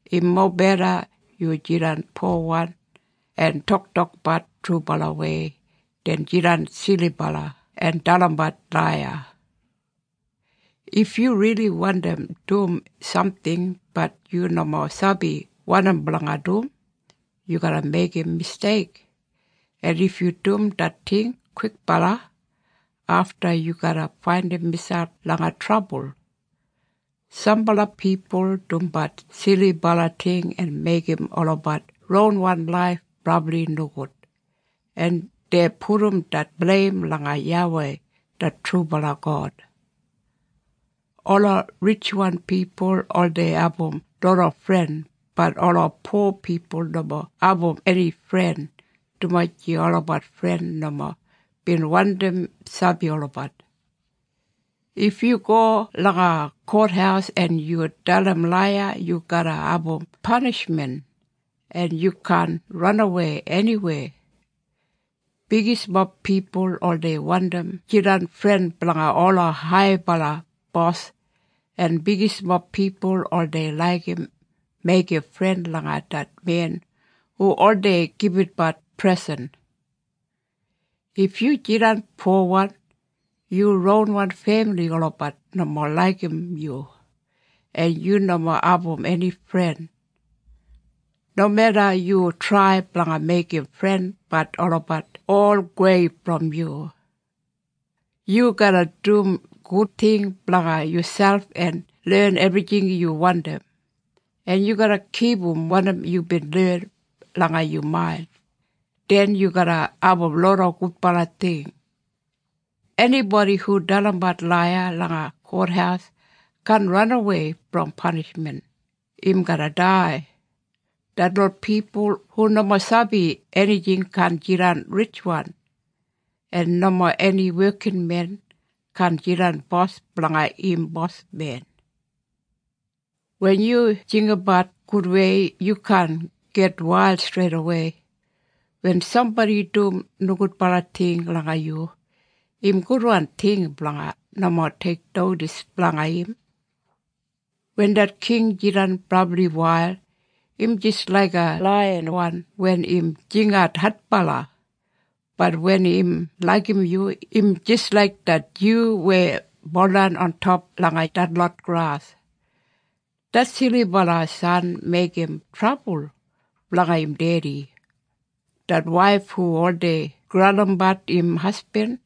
Im mobeda yu jidan powan en toktokbat trubalawei den jidan silibala en dalimbat laiya. If yu rili wandim dum samting bat yu nomo sabi wanim blanga dum, yu garra meigim misteik. En if yu dum det ting kwikbala, afta yu garra faindim miselp langa trabul. Sambala pipul dumbat silibala ting en meigim olabat ronwan laif brabli nogud, en dei pudum det bleim langa YAWEI det trubala God. Ola ritjwan pipul oldei abum loda fren, bat ola po pipul nomo abum eni fren dumaji olabat fren nomo bin wandim sabi olabat. If yu go langa kothaus en yu dalim laiya yu garra abum panishmen, en yu kaan ranawei eniweya. Bigismob pipul oldei wandim jidan fren blanga ola haibala bos en bigismob pipul oldei laigim meigim fren langa det men hu oldei gibitbat presen. If yu jidan powan, yu ronwan femili olabat nomo laigim yu en yu nomo abum eni fren. Nomeda yu trai blanga meigim fren bat olabat ol gowei brom yu. Yu garra dum gud ting blanga yuselp en len ebrijing yu wandim, en yu garra kipum wanim yubin len langa yu main, den yu garra abum loda gudbala ting. Enibodi hu dalimbat laiya langa kothaus kaan ranawei brom panishmen, im garra dai. Detlot pipul hu nomo sabi enijing kaan jidan ritjwan, en nomo eni wekinmen kaan jidan bos blanga im bosmen. Wen yu jinggabat gudwei yu kaan gitwail streidawei. Wen sambodi dum nogudbala ting langa yu, im gudwan ting blanga nomo teiknodis blanga im. Wen det king jidan brabli wail, im jis laiga laiyan wen im jingat adbala, bat wen im laigim yu im jis laik det dyu weya buldan ontop langa detlot gras. Det silibala san meigim trabul blanga im dedi. Det waif hu oldei graulimbat im hasbin,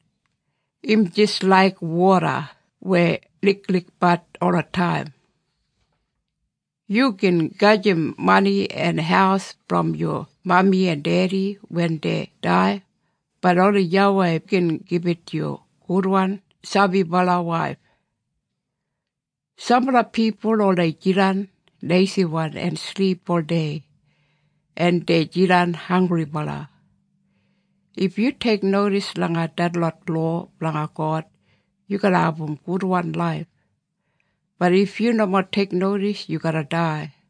im jis laik woda weya liklikbat olataim. Yu gin gajim mani en haus brom yu mami en dedi wen dei dai, bat oni YAWEI gin gibit yu gudwan sabibala waif. Sambala pipul oldei jidan leisiwan en silip oldei, en dei jidan hanggribala. If yu teiknodis langa detlot lowa blanga God yu garra abum gudwan laif, bat if yu nomo teiknodis yu garra dai.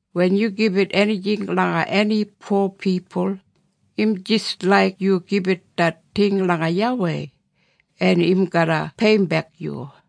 Wen yu gibit enijing langa eni po pipul im jis laik yu gibit det ting langa YAWEI, en im garra peiyimbek yu.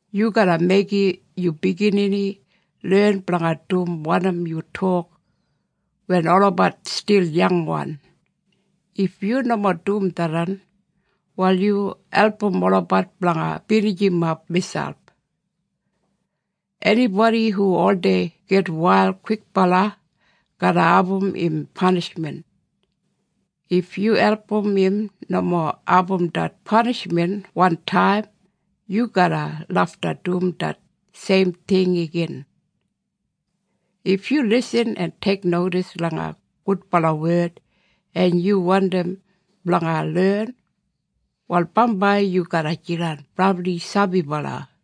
Yu garra meigim yu biginini len blanga dum wanim yu tok wen olabat stil yangwan. If yu nomo dum tharran, wal yu album olabat blanga binijimap miselp. Enibodi hu oldei gitwail kwikbala garra abum im panishmen. If yu album im nomo abum det panishmen wantaim, yu garra lafta dum det seim ting igin. If yu lisin en teiknodis langa gudbala wed en yu wandim blanga len, wal bambai yu garra jidan brabli sabibala.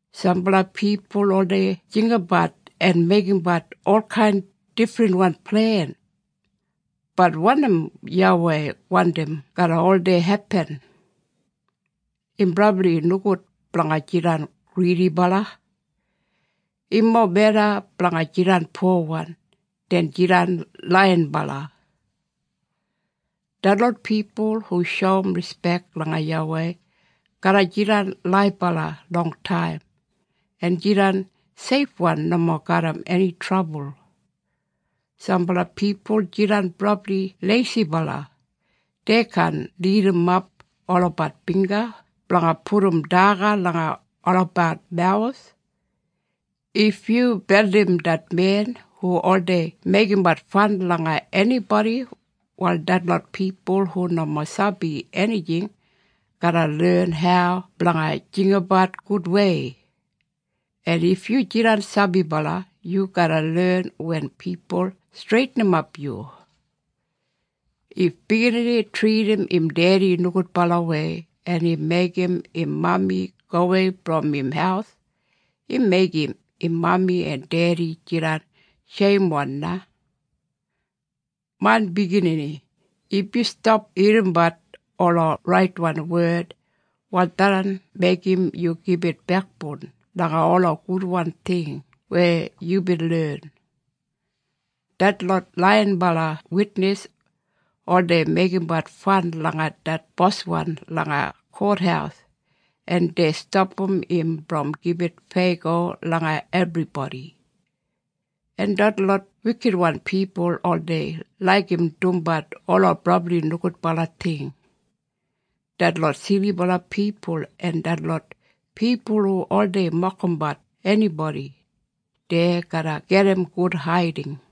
Sambala pipul oldei jinggabat en meigimbat olkain difrinwan plen, bat wanim YAWEI wandim garra oldei hepin. Im brabli nogud blanga jidan gridibala. Im mobeda blanga jidan powan den jidan laiyinbala. Detlot pipul hu shoum rispek langa YAWEI garra jidan laibala longtaim en jidan seifwan nomo garram eni trabul. Sambala pipul jidan brabli leisibala. Dei kaan lidimap olabat bingga blanga pudum daga langa olabat mawus. If yu beldim det men hu oldei meigimbat fan langa enibodi, wal detlot pipul hu nomo sabi enijing garra len hau blanga jinggabat gudwei. En if yu jidan sabibala, yu garra len wen pipul streitinimap yu. If biginini tridim im dedi nogudbalawei en im meigim im mami gowei brom im haus, im meigim im mami en dedi jidan sheimwan na. Main biginini, if yu stap irrimbat ola raitwan wed, wal tharran meigim yu gibit bekboun langa ola gudwan ting weya yubin len. Detlot laiyinbala witnis oldei meigimbat fan langa det boswan langa kothaus en dei stapam im brom gibit feyago langa ebribodi. En detlot wikitwan pipul oldei laigim dumbat ola brabli nogudbala ting. Detlot silibala pipul en detlot pipul hu oldei mokimbat enibodi, dei garra gedim gud haiding.